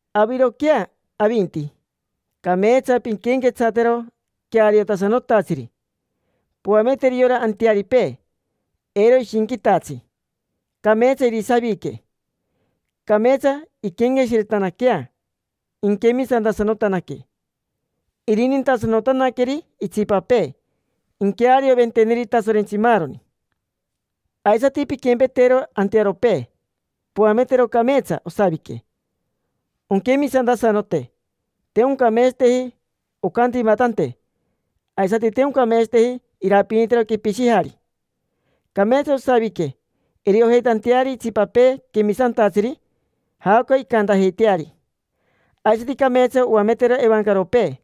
Aviroquea, avinti, cameetsa pinquenquetsatero queariotasanotatsiri. Poameteri yora antearipee eiro ishinquitatsi, cameetsa irisavique, cameetsa inquenqueshiretanaquea, inquemisantasanotanaque, irinintasanotanaqueri itsipapee, inquearioventeneri Tasorentsi maaroni. Aisati pinquempetero antearopee, poametero cameetsa osavique, onquemisantasanote. Te oncameetsateji oncantimatante, aisati te oncameetsateji irapinitero quepishijari. Cameetsa osavique iriojeitanteari itsipapee quemisantatsiri jaoca incantajeiteari. Aisati cameetsa oametero evancaropee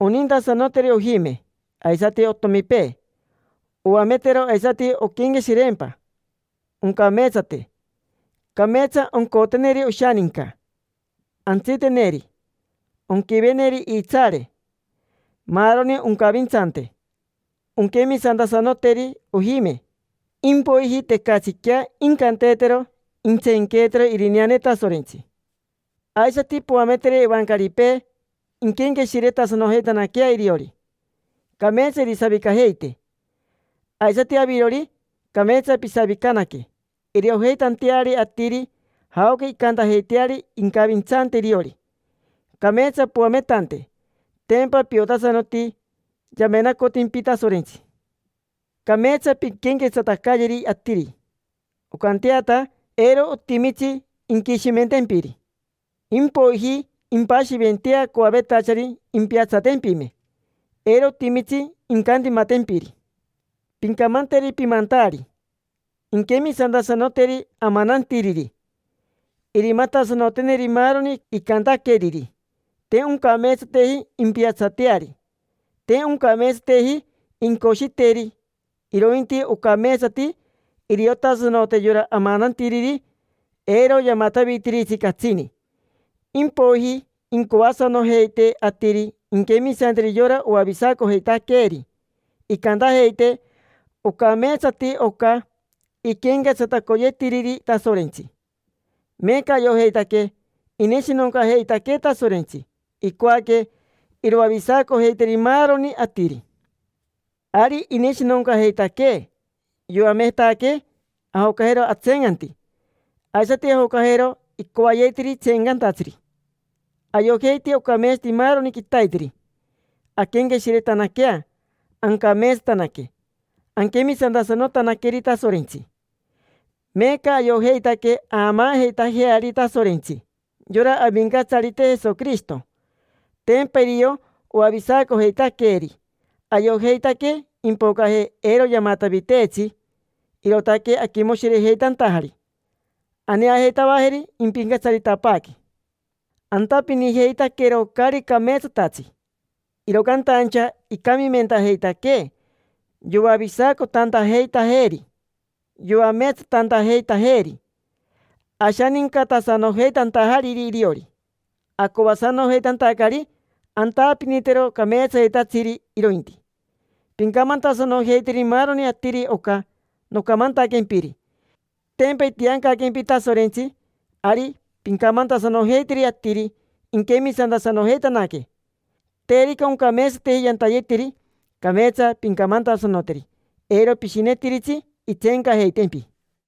onintasanoteri ojime aisati otomipee. Oametero aisati onquenqueshireempa, oncameetsate; cameetsa oncoteneri oshaninca, antsiteneri, onquiveneri iitsaare, maaroni oncavintsante, onquemisantasanoteri ojime. Impoiji tecatsiquea incanteetero intseenqueetero irineane Tasorentsi. Aisati poameteri evancaripee inquenqueshiretasanojeitanaquea iriori, cameetsa irisavicajeite. Aisati avirori, cameetsa pisavicanaque, iriojeitanteari atiri jaoca incantajeiteari incavintsante iriori. Cameetsa poametante, tempa piotasanoti yamenacotimpi Tasorentsi. Cameetsa pinquenquetsatacayeri atiri, oncanteata eiro otimitsi inquishimentempiri. Impoiji impashiventea coavetachari impiatsatempime, eiro otimitsi incantimatantempiri. Pincamanteri pimantaari inquemisantasanoteri amanantiriri, irimatasanoteneri maaroni icantaqueriri. Te oncameetsateji impiatsateari, te oncameetsateji incoshiteri. Irointi ocameetsati iriotasanote yora amanantiriri eiro yamatavitiritsi catsini. Impoiji incoasanojeite atiri inquemisanteri yora oavisacojeitaqueeri, incantajeite: “Ocameetsati oca iquenquetsatacoyeetiriri Tasorentsi”. Meeca ayojeitaque ineshinoncajeitaquee Tasorentsi, icoaque iroavisacojeiteri maaroni atiri. Ari ineshinoncajeitaquee, yoametaquee ajocajero atseencanti, aisati ajocajero icoajeitiri tseencantatsiri. Ayojeiti ocameetsati maaroni quitaiteri anquenqueshiretanaquea, ancameetsatanaque, anquemisantasanotanaqueri Tasorentsi. Meeca ayojeitaque aamaajeitajeari Tasorentsi: yora Avincatsarite Jesoquirishito. Tempa irio oavisacojeitaqueeri. Ayojeitaque impocaje, eiro yamataviteetsi, irootaque aquimoshirejeitantajari. Aneajeitavajeri, impincatsaritapaaque. Antapinijeitaquero caari cameetsatatsi, iro cantaincha icamimentajeitaquee yoavisacotantajeitajeeri, yoameetsatantajeitajeeri, ashanincatasanojeitantajariri iriori, acoasanojeitantacari antapinitero cameetsayetatsiri irointi. Pincamantasanojeiteri maaroni atiri oca nocamantaquempiri. Tempa itiancaquempi Tasorentsi, ari pincamantasanojeiteri atiri inquemisantasanojeitanaque. Terica oncameetsateji yantayetiri, cameetsa pincamantasanoteri. Eiro pishinetiritsi intseencajeitempi.